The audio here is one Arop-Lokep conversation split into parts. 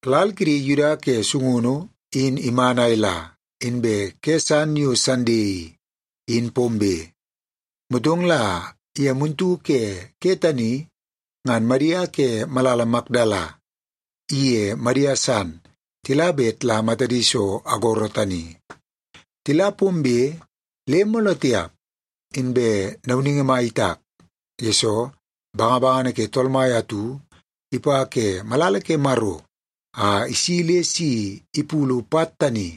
Lal kidi Yuda ke sungunu in iman a ila, inbe ke san yo Sande i, in pombe. Motong la ye muntu ke ke tani ngan Madia ke malala Makdala iye Madia san tila bet la matadi so agoro tani. Tila pombe le mooloo tiap, inbe nauningi mai itak, yesoo bangabangana ke Tool Mai atu ipa ke malala ke Maro a isi le si ipulu pat tani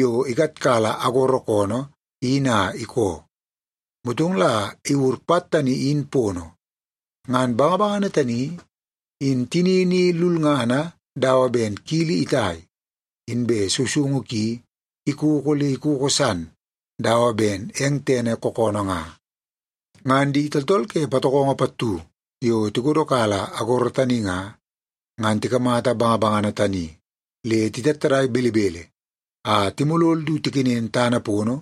yo ikatkala agoro koonoo in a ikoo. Motong la lo iwur pat tani in pono. Ngan bangabangana tani, in tinini i lulngana dawa ben kili itai, inbe sousoungu ki ikoko le ikoko san dawa ben eng tene kookoonoo nga. Ngan di tooltool ke patokongo pattu yo tikodokala agoro tani nga, ngan tikamata bangabangana tani le titattadai belebele a timolol du tikenen tana pono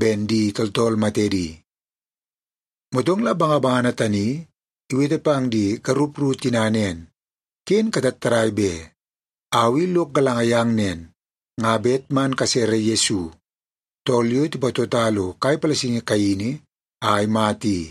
ben di tooltool matedi. Motong la bangabangana tani iwete pang di garup ru tina nen, “Ken katattadai be! Au i lok galanga yang nen, nga bet man kasere Yesu, tool yo tipatota lo kai palasingi kaini a imata i.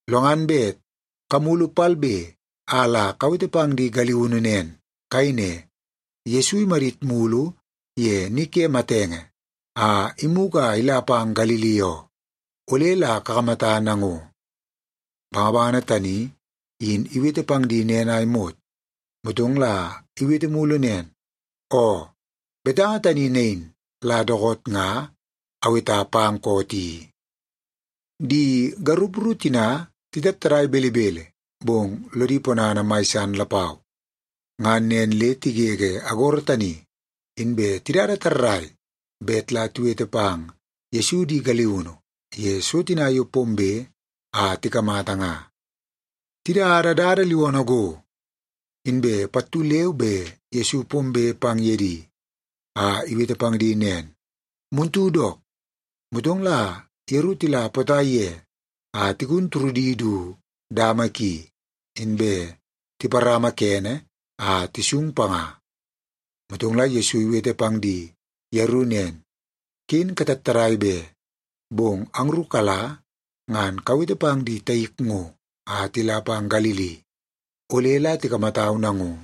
Lo ngan bet kamulu palbe a la kawete pang di galiunu nen. Kayei ne, ‘Yesu imadit mulu ye ni ke matenge a imugu a ila pang Galili oo. Ole la kakamata nango.’” Bangabangana tani in iwete pang di nen a imot, motong la iwete mulu nen, “Oo, betanga tani nain la dookoot nga aweta pang koot i.” Di garup ru tina titattadai belebele, bong lodi ponana mai san lapau. Ngan nen le tigege agoro tani, inbe tidada tarrai bet la tiwete pang Yesu di galiunu ye so tina yo pombe a tikamata nga. Tidada dada liwoonoo go, inbe pattu leu be Yesu pombe pang ye di a iwete pang di nen, “Muntu dook.” Motong la yeru tila potai ye a tigun turudi du dama ki, inbe tiparama kene a tisung panga. Motong la Yesu iwete pang di yeru nen, “Ken katattadai be! Bong angru kala ngan kawete pang di taik ngo a tila pang Galili. Ole la tikamatau nango.”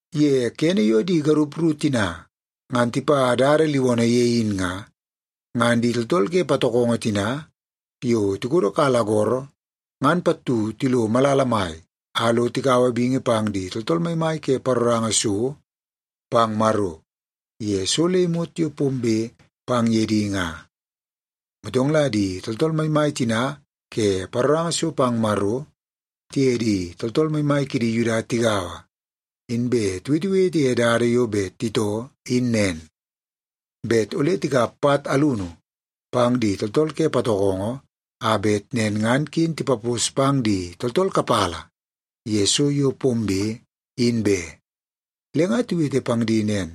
Ye kene yo di garup ru tina ngan tipa dada liwoonoo ye in nga, ngan di tooltool ke patokongo tina yo tikodokala agoro ngan pattu tilo malala mai a lo tikaua bingi pang di tooltool maimai ke paroranga so pang Maro, ye so le imot yo pombe pang ye di nga. Motong la di tooltool maimai tina ke paroranga so pang Maro tiye di tooltool maimai kidi Yuda tigaua, inbe tiwetewete ye dada yo bet titoo in nen, bet ole tikap pat alunu pang di tooltool ke patokongo a bet nen ngan ken tipapos pang di tooltool kapala ye so yo pombe, in be. Le nga tiwete pang di nen,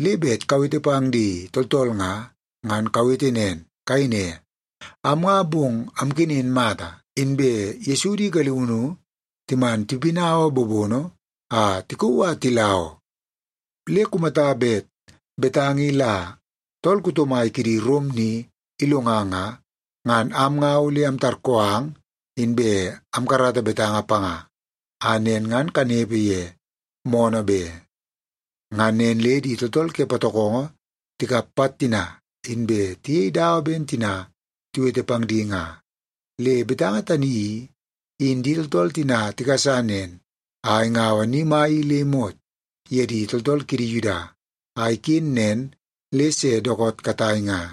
“Le bet kawete pang di tooltool nga, ngan kawete nen. Kayei ne, ‘Am nga, bong amkenen mata, inbe Yesu di galiunu timan tipinaua bobono a tikauu a tila oo.’ Le kumata bet betanga i la tool kuto mai kidi Rom ni ilonga nga, ngan am nga ole amtarkoo ang inbe amkarata betanga panga, a nen ngan kanepe ye moonoo be.” Ngan nen le di tooltool ke patokongo tikap pat tina, inbe tiyei dawa ben tina tiwete pang di nga. Le betanga tani i, in di tooltool tina tigasa nen a ingaua ni mai i le imot ye di tooltool kidi Yuda, a iken nen le se dookoot katai nga.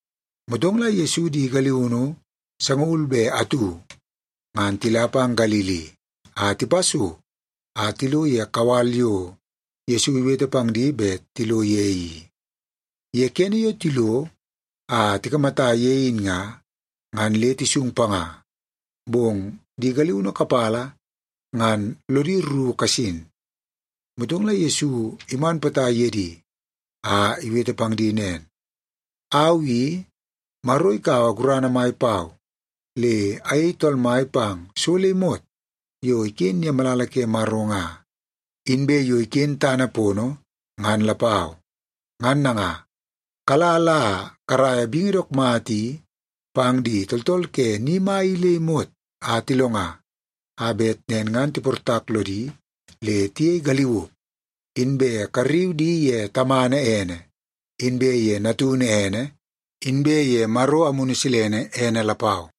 Motong la Yesu di galiunu sangaul be atu, ngan tila pang Galili a tipa so a tilo ye kawal yo Yesu iwete pang di bet tilo ye i. Ye kene yo tilo a tikamata ye in nga, ngan le tisung panga. Bong di galiunu kapala ngan lodi rru kasin. Motong la Yesu iman potai ye di a iwete pang di nen, “Au i, Maro kaua gurana mai pau, le ayei Tool Mai pang so le imot yo iken ye malala ke Maro nga, inbe yo iken tana pono, ngan lapau. Ngan nanga, kala la karaia bingi dook mata i pang di tooltool ke ni mai i le imot a tilonga, a bet nen ngan tiportak lodi le tiyei galiuk. Inbe karriu di ye Tamana ene, inbe ye Natunu ene, inbe ye Maro Amunu Silene ene lapau.